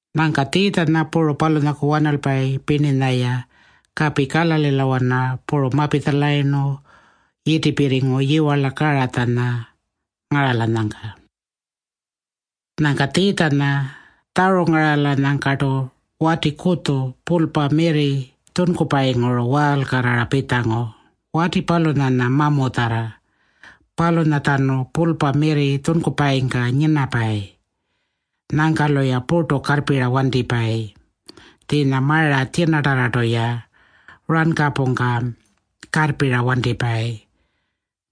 Nyangka Tjiitjanya puru palunyaku wanalpayi pirninya-ya kapi Kalalilawana puru mapitjalayirnu yitipirringu yiwarla Karatjanya ngaralanyangka. Nyangka Tjiitjanya tjarungaralanyangkartu wati kutju pulpa mirri tjunkupayinguru waalkarrara pitjangu. Wati palunyanya mamutjarra. Palunyatjanu pulpa mirri tjunkupayingka nyinapayi. Nyangka-luya purtu karrpira wantipayi. Tjiinya mara tjinatarrartu-ya rankapungka karrpira wantipayi.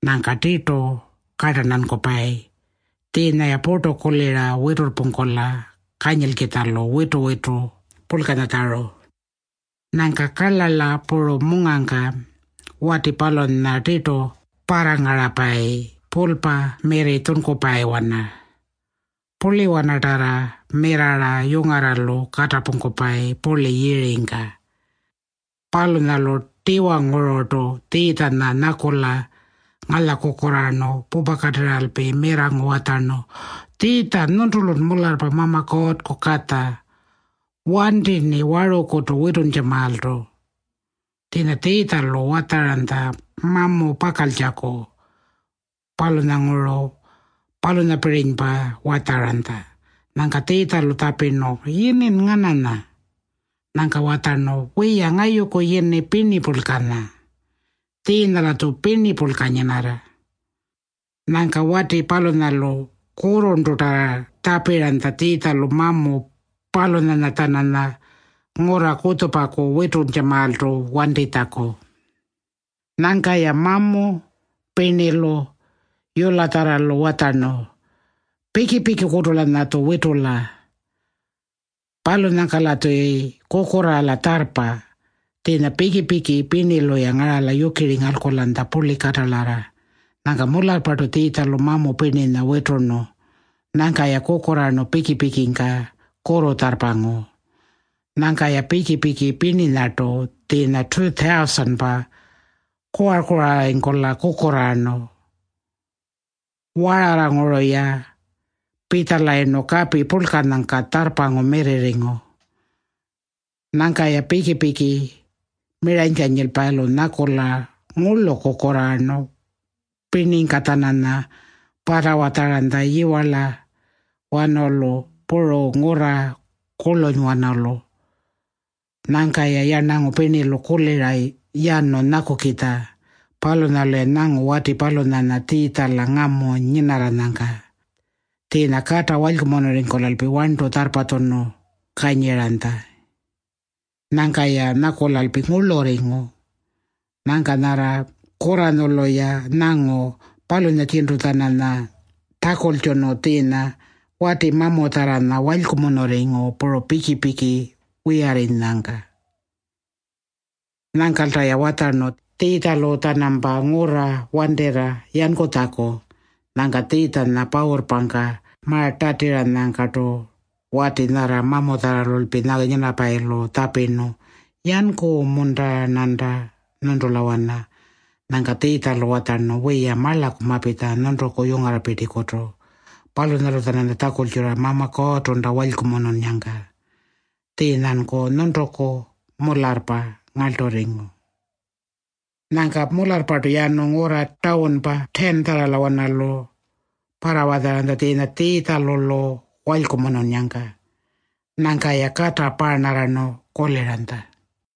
Nyangka tirtu kartarntankupayi. Tjiinya-ya purtu kulira witurrpungkula kanyilkitjalu witu-witu purlkanyatjaru. Nyangka karlarla puru mungangka wati palunyanya tirtu parrangarapayi pulpa mirri tjunkupayiwana. Purliwanatarra mirrarra yungarralu katapungkupayi purli yiringka. Palunyalu tiwangururtu Tjiitjanya nyakula ngalyakukurraarnu pupakatirralpi mirrangu watjarnu, “Tjiitja, nyuntulun mularrpa Mama Kuurrku Katja. Wanti-rni warukutu wituntjamaaltu.” Tjiinya Tjiitjalu watjaranytja mamu pakaltjaku. Palunyanguru palunyapirinypa watjaranytja. Nyangka Tjiitjalu-lu tjapirnu, “Yinin ngananya?” Nyangka watjarnu, “Wiya, ngayuku yini Pirnipurlkanya. Tjiinya-latju pirnipurlka nyinarra.” Nyangka wati palunyalu kurrurntutarra tjapiranytja Tjiitjalu mamu palunyanya-tjananya ngurra kutjupaku wituntjamaaltu wantitjaku. Nyangka-ya mamu pirnilu yulatjarralu watjarnu, “Piki-pikikutu-lanyatju witula. Palunyangka-latjuyi kukurraala tjarrpa.” Tjiinya piki-piki pirnilu-ya ngarala yukiri ngalkulanytja purli katalarra. Nyangka mularrpartu Tjiitjalu mamu pirninya witurnu. Nyangka-ya kukurraarnu piki-pikingka kurrutjarrpangu. Nyangka-ya piki-piki pirninyartu, tjiinya 2,000-pa, kuwar-kuwararringkula kukurraarnu. Wararranguru-ya pitjalayirnu kapi purlkanyangka tjarrpangu mirrirringu. Nyangka-ya piki-piki miranykanyilpayilu nyakula ngurlu kukurraarnu pirningka-tjananya parrawatjaranytja yiwarlawanalu puru ngurra kurlunywanalu. Nyangka-ya yarnangu pirnilu kulira yanu nyakukitja. Palunyalu-ya nyangu wati palunyanya Tjiitjala ngamu nyinarranyangka. Tjiinya kata walykumunurringkulalpi warntu tjarrpatjunu kanyiranytja. Nyangka-ya nyakulalpi ngurlurringu. Nyangka nyarra kurranyulu-ya nyangu, palunyatjintu-tjananya tjakultjunu tjiinya wati mamutjarranya walykumunurringu puru piki-piki wiyarrinyangka. Nyangkalta-ya watjarnu Tjiitjalu-tjanampa ngurra wantirra yankutjaku. Nyangka Tjiitjanya pawurrpangka ma-tatiranyangkartu wati nyarra mamutjarralpi nyinapayilu tjapirnu, “Yanku-munta-rnanta nyuntulawana?” Nyangka Tjiitjalu watjarnu, “Wiya, marlaku mapitja nyuntuku yungarrapirtikutu. Palunyalu-tjananya tjakultjurra Mama Kuurrtunta walykumununnyangka. Tjiinyanku nyuntuku mularrpa ngarlturringu.” Nyangka mularrpartu yanu ngurra Tawunpa 10-tjarralawanalu parrawatjaranytja tjiinya Tjiitjalu-lu walykumununnyangka. Nyangka-ya kata paarnarrarnu kuliranytja.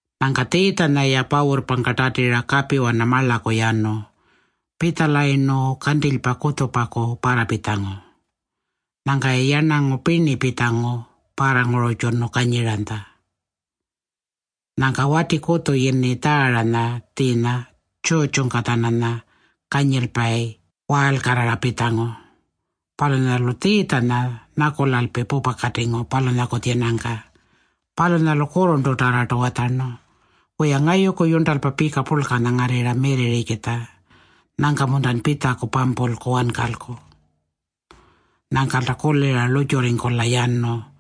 Nyangka Tjiitjanya-ya pawurrpangka tatira kapiwana marlaku yanu. Pitjalayirnu, kantilypa kutjupaku parrapitjangu. Nyangka-ya yarnangu pirni pitjangu parrangururrtjunu kanyiranytja. Nyangka wati kutju yini Tjaaranya tjiinya tjurrtjungka-tjananya kanyilpayi waalkarrara pitjangu. Palunyalu Tjiitjanya nyakulalpi pupakatingu palunyaku tjinangka. Palunyalu kurrurntutarrartu watjarnu, “Wiya, ngayuku yurntalpa pika purlkanya ngarrirra mirrirrikitja. Nyangka-muntan pitjaku pampulku wankalku?” Nyangkalta kulira lurrtjurringkula yanu.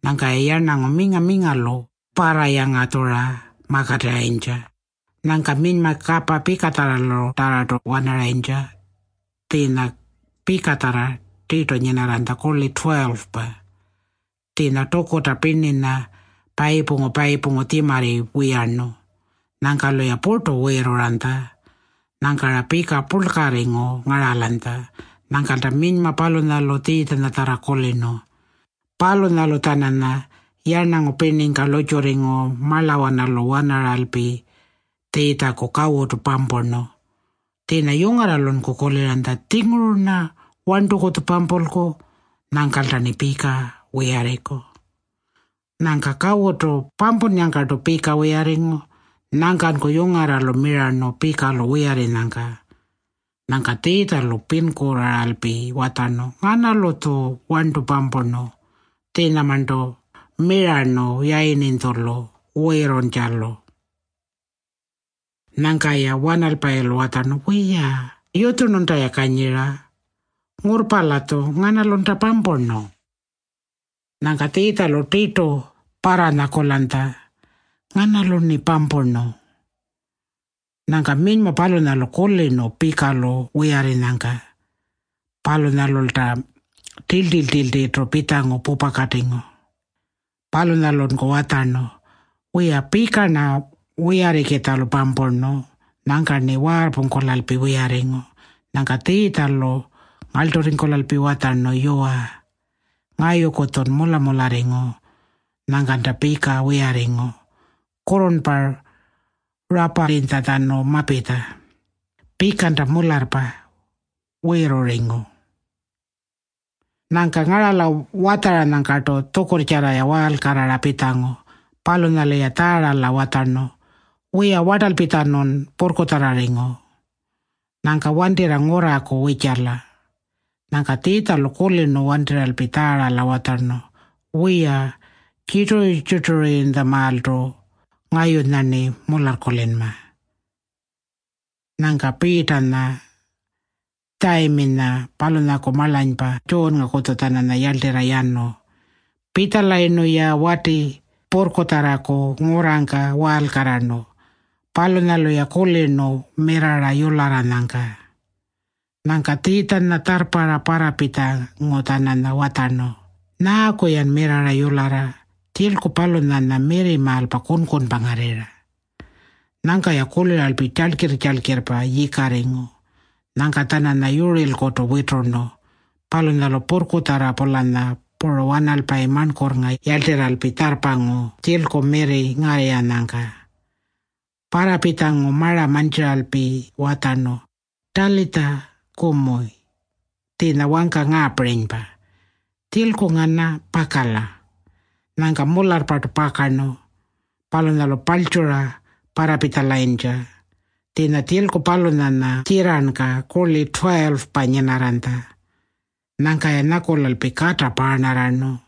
Nyangka-ya yarnangu minga-mingalu parrayangatjura makatirrayintja. Nyangka minyma kapa pikatjarralutarrartu wanaranytja. Tjiinya pikatjarra tirtu nyinarranytja kurli 12-pa. Tjiinya tukuta pirninya payipungu-payipungu tjimarri wiyarnu. Nyangka-luya purtu wiirruranytja. Nyangka-ra pika purlkarringu ngaralanytja. Nyangkalta minyma palunyalu Tjiitjanyatjarra kulirnu. Palunyalu-tjananya yarnangu pirningka lurrtjurringu marlawanalu wanaralpi Tjiitjaku kawutu pampurnu. Tjiinya yungarralunku kuliranytja, “Tjinguru-rna warntukutju pampulku. Nyangkalta-rni pika wiyarringku.” Nyangka kawutu pampunnyangkartu pika wiyarringu. Nyangkanku yungarralu mirarnu pika-lu wiyarrinyangka. Nyangka Tjiitjalu pinkurraaralpi watjarnu, “Nganalu-tju warntu pampurnu?” Tjiinyamarntu mirarnu yayirninytjulu wiirruntjalu. Nyangka-ya wanalpayilu watjarnu, “Wiya, yutjurnunta-ya kanyira. Ngurrpa-latju. Nganalunta pampurnu?” Nyangka Tjiitjalu tirtu parranyakulanytja, “Nganalu-rni pampurnu?” Nyangka minyma palunyalu kulirnu pika-lu wiyarrinyangka. Palunyalulta tiltirr-tiltirrpa pitjangu pupakatingu. Palunyalunku watjarnu, “Wiya, pika-rna wiyarrikitjalu pampurnu. Nyangka-rni waarrpungkulalpi wiyarringu.” Nyangka Tjiitjalu ngarlturringkulalpi watjarnu, “Yuwa, ngayuku-tjun mula-mularringu. Nyangkanta pika wiyarringu. Kurrurnpa raparrinytjatjanu mapitja. Pikanta mularrpa wiirrurringu.” Nyangka ngarala watjaranyangkartu tjukurrtjarra-ya waalkarrara pitjangu. Palunyalu-ya Tjaarala watjarnu, “Wiya, wartalpitjanun purrkutjarrarringu. Nyangka wantirra ngurraku wirrtjala.” Nyangka Tjiitjalu kulirnu wantirralpi Tjaarala watjarnu, “Wiya, tjirturu-tjirtururrinytjamaaltu ngayunya-rni mularrkulinma.” Nyangka Piitanya, Tjayiminya palunyaku marlanypa Tjuunngakutju-tjananya yarltirra yanu. Pitjalayirnu-ya wati purrkutjarraku ngurrangka waalkarrarnu. Palunyalu-ya kulirnu mirrarra yularranyangka. Nyangka Tjiitjanya tjarrparra parrapitjangu-tjananya watjarnu, “Nyaaku-yan mirrarra yularra? Tjilku palunyanya mirrimaalpa, kunkunpa ngarrirra.” Nyangka-ya kuliralpi tjalkirr-tjalkirrpa yikarringu. Nyangka-tjananya yurirlkutu witurnu. Palunyalu purrkutjarra-pulanya puru wanalpayi marnkurrnga yarltirralpi tjarrpangu tjilku mirri ngarrirranyangka. Parrapitjangu mara mantjiralpi watjarnu, “Talitja kumi.” Tjiinya wangka ngaapirinypa, “Tjilku ngana, pakala.” Nyangka mularrpartu pakarnu. Palunyalu paltjura parrapitjalayintja. Tjiinya tjilku palunyanya tjirrarnka kurli 12-pa nyinarranytja. Nyangka-ya nyakulalpi kata paarnarrarnu.